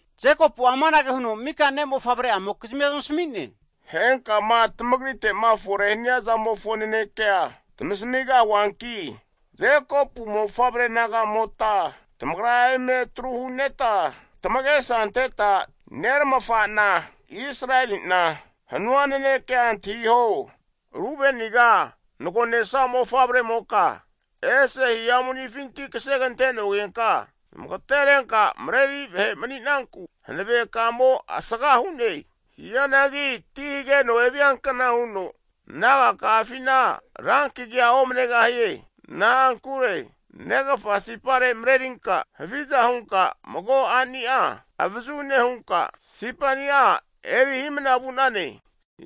Jekopu'a amanage huno mika ne'mofavre'amokizmi zamasmi'ne, Henkama tamagrite'ma fore hania zamofo nanekea tamasamigahuanki, Jekopu mofavre naga'nimota tamagra eme atru huneta tamagesa anteta nerafa'na Israeli'na hanua nanekea antahiho. Rubeniga nagonesa mofavremoka, ese hihamu ni'afinti kasegante'nogenka zamagaterenka mareri vahe mani'nanku, hanave kamo asaga hu'ne. Hianagi timo hageno eviankna huno, nagakafina ran kagia omanegahie. Na'ankure negafa sipare marerinka haviza hunka mago a'ni'a avazu nehunka sipani'a eri hi'mna vu'nane.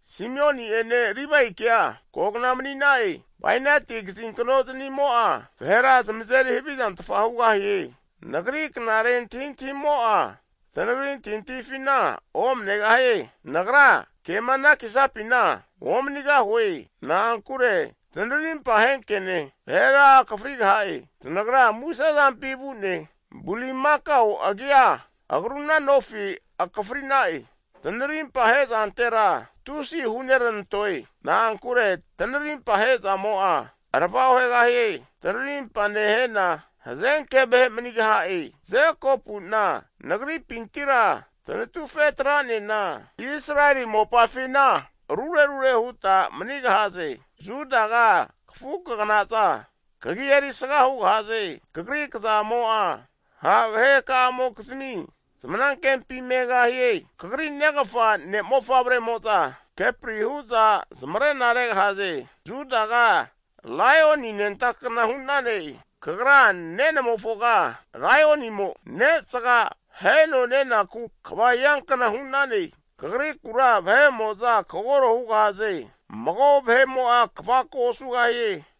Simioni'ene Livaikea kogna mani'na'e. Bainati kazinkno zanimo'a, vahera zamazeri havizantfa hugahie. Nagri knare antahi antahimo'a, tanagri antahi antahifina omanegahie. Nagra kema anakisapina omanigahue. Na'ankure zanarimpa ahenke'ne vahera akafrigaha'e. Zanagra musezampi vu'ne, Bulimakao agia agruna nofi akafrina'e. Tanarimpa ahe'zantera tusi huneranantoe. Na'ankure tanarimpa ahezamo'a arava ohegahie. Tanarimpa nehena, hazenke vahe manigaha'e. Jekopu'na nagri'pintira tanatufe atra'nena, Israeli mopafina arure arure huta manigahaze. Judaga kafu kaganaza kagi erisga hugahaze. Kagri kazamo'a ha' vahe ka'amokizmi zamanankempi megahie. Kagri negafa ne'mofavremo'za kepri hu'za zamarena regahaze. Judaga laioni anenta kna hu'nane. Kagra nenamofoga laionimo ne'zaga aheno nenaku kva hiankna hu'nane. Kagrikura vahe'mo'za kagoro hugahaze. Mago vahe'mo'a kvako osugahie.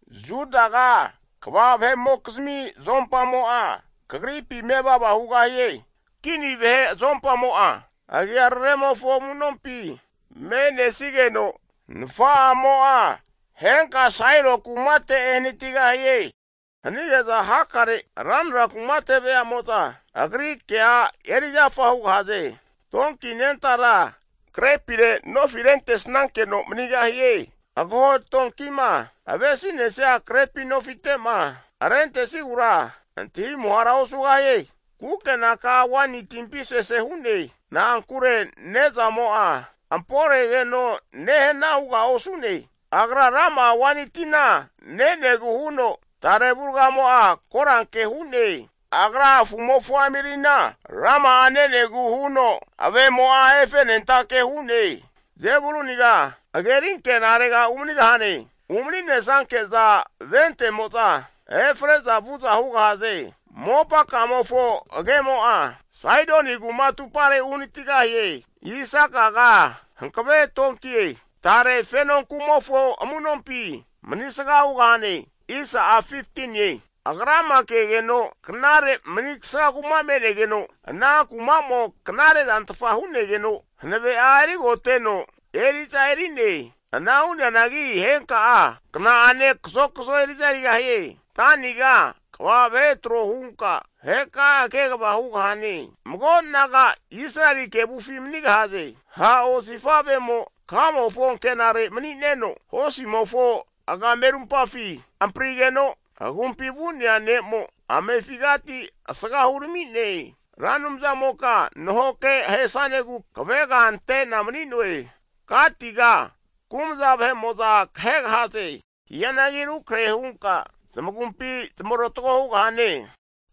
Judaga kva vahe'mokizmi azompamo'a kagripi mevava hugahie. Kini vahe azompamo'a agiararemofo amu'nompi me'nesigeno, Nafa'amo'a henka Sailo kumate ehanatigahie. Hanige'za hakare ranra kumate veamo'za agri kea erizafa hugahaze. Donki anentara krepire nofiteti rentesnankeno manigahie. Agaho donkima avesi'nesia krepi nofite'ma arentesigura antahi muhara osugahie. Kukena'a waini timpi sese hu'ne, na'ankure ne'zamo'a amporegeno nehana huga osu'ne. Agra rama'a waini tina nenegu huno tare avurgamo'a koranke hu'ne, agra afu'mofo amirina rama'a nenegu huno, ave'mo'a efenentake hu'ne. Zebuluniga hageri ankenare umanigahane. Umani'nesanke'za vente'mo'za efre'za vu'za hugahaze. Mopa kamofo agemo'a Saidoni kuma atupare uhanatigahie. Isakaga hankave donkie, tare fenonku'mofo amu'nompi manigsa hugahane. Agrama kegeno knare manigsa kuma me'negeno, ana kumamo knare zantfa hu'negeno, hanave'a erigoteno eri'za eri'ne. Ana hu'neanagi henka'a kna'ane kazokzo eri'za erigahie. Daniga kva (jas) vahe tro hunka vaheka'a kegava hugahane. Mago naga Israeli kevufi manigahaze. Ha' osifavemo kamofo ankenare mani'neno, hosimofo agamerumpafi amprigeno, agumpifi vu'nea ne'mo amefigati asga hurami'ne. Ra Anumzamoka nahoke ahesnanegu, kavega ante'na mani'noe. Gatiga kumza vahe'mo'za kahegahaze. Hianagi rukrahe hunka, zamagumpi zamarotgo hugahane.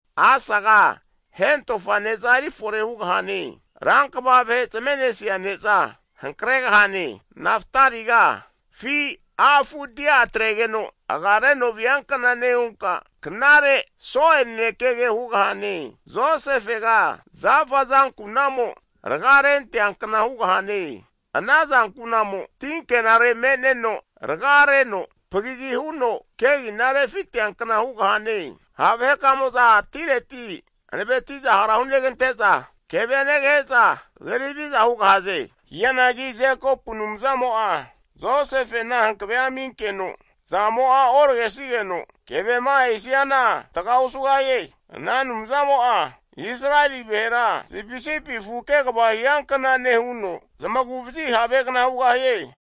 Asaga hentofa ne'za eri fore hugahane. Rankva vahe zame'nesia ne'za, hankregahane. Naftaliga, afi a' afu dia atregeno agareno viankna nehunka, knare so'e nanekege hugahane. Josefega zafa azankunamo raga renteankna hugahane, azankunamo ti ankenare me'neno raga reno, pagagi huno kegina refiteankna hugahane. Ha' vahekamo'za atireti hanaveti'za hara hunegante'za, kevea negahe'za, kazeri haviza hugahaze. Hianagi Jekopu Anumzamo'a Josefena hankavea aminkeno azamo'a oragesigeno, kevema ahesiana hantaga osugahie. Ana Anumzamo'a Israeli vahera sipisipi afu kegava hiankna nehuno, zamagu'vazi havegna hugahie.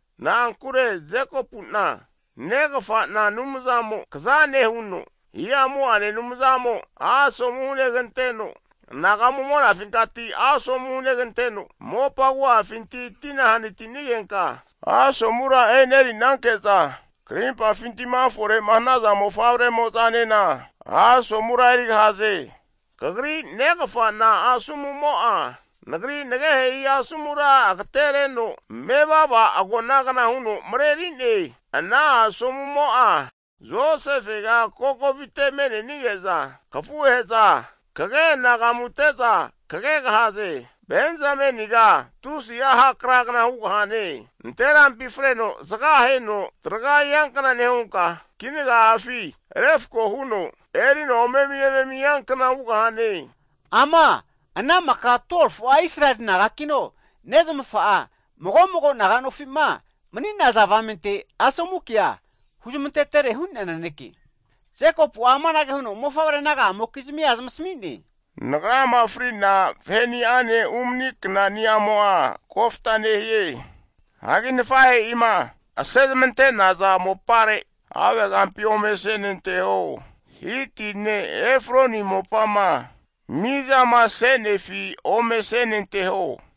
Na'ankure Jekopu'na negafa'na Anumzamo kaza nehuno, hihamu'ane Anumzamo asomu huneganteno, anagamu monafinkati asomu huneganteno, mopa agu'afinti tina hanati'nigenka asomura e'nerinanke'za, karimpafinti'ma fore hanaza mofavre'mo'zanena asomura erigahaze. Kagri negafa'na asomumo'a nagri nagehe'i asomura agatereno mevava agonagna huno mareri'ne, ana asomumo'a, Josefega kokovite me'nenige'za, kafuhe'za kage anagamute'za kagegahaze. Benzameniga afi ha' kragna (wolf) hugahane. Nanterampi freno zaga aheno traga hiankna nehunka, kinaga'afi refko huno erino ome'mi eme'mi hiankna hugahane. Ama ana maka 12fu'a Israeli nagakino, nezmafa'a mago mago naga nofi'ma mani'naza avamente asomu kea huzmantetere hu'nea naneke. Jekopu'a amanage huno mofavre naga'amokizmia zamasmi'ne, Nagrama fri'na vahe'ni'ane umani knanimo'a kofta nehie. Hagi nafahe'ima ase zamante'naza mopare, havegampi ome asenanteho. Hiti ne' Efroni mopama mizama se'nefi ome asenanteho.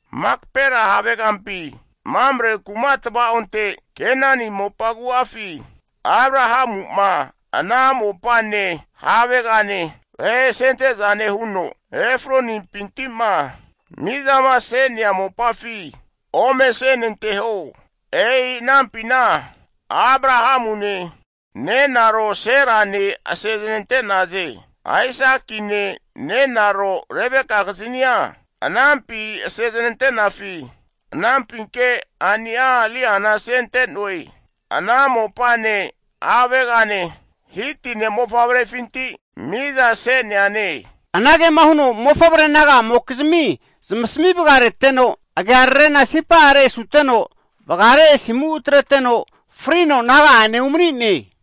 Makapela havegampi Mamre kuma tvaonte Kenani mopa agu'afi, Abrahamu'ma ana mopane havegane vahe asente'zane huno Efroni'pinti'ma mizama se'nea mopafi ome asenanteho. E'i anampina Abrahamune nenaro Serane ase'znante'naze. Aisakine nenaro Rebekagiznia anampi ase znante'nafi, anampinke a'ni'a Liana asente'noe. Ana mopane havegane Hiti ne' mofavrefinti miza se'neane. Anagema huno mofavre naga'amokizmi zamasmi vaga reteno, agiararena sipare asuteno vagare asimu atreteno frino naga'ane umani'ne.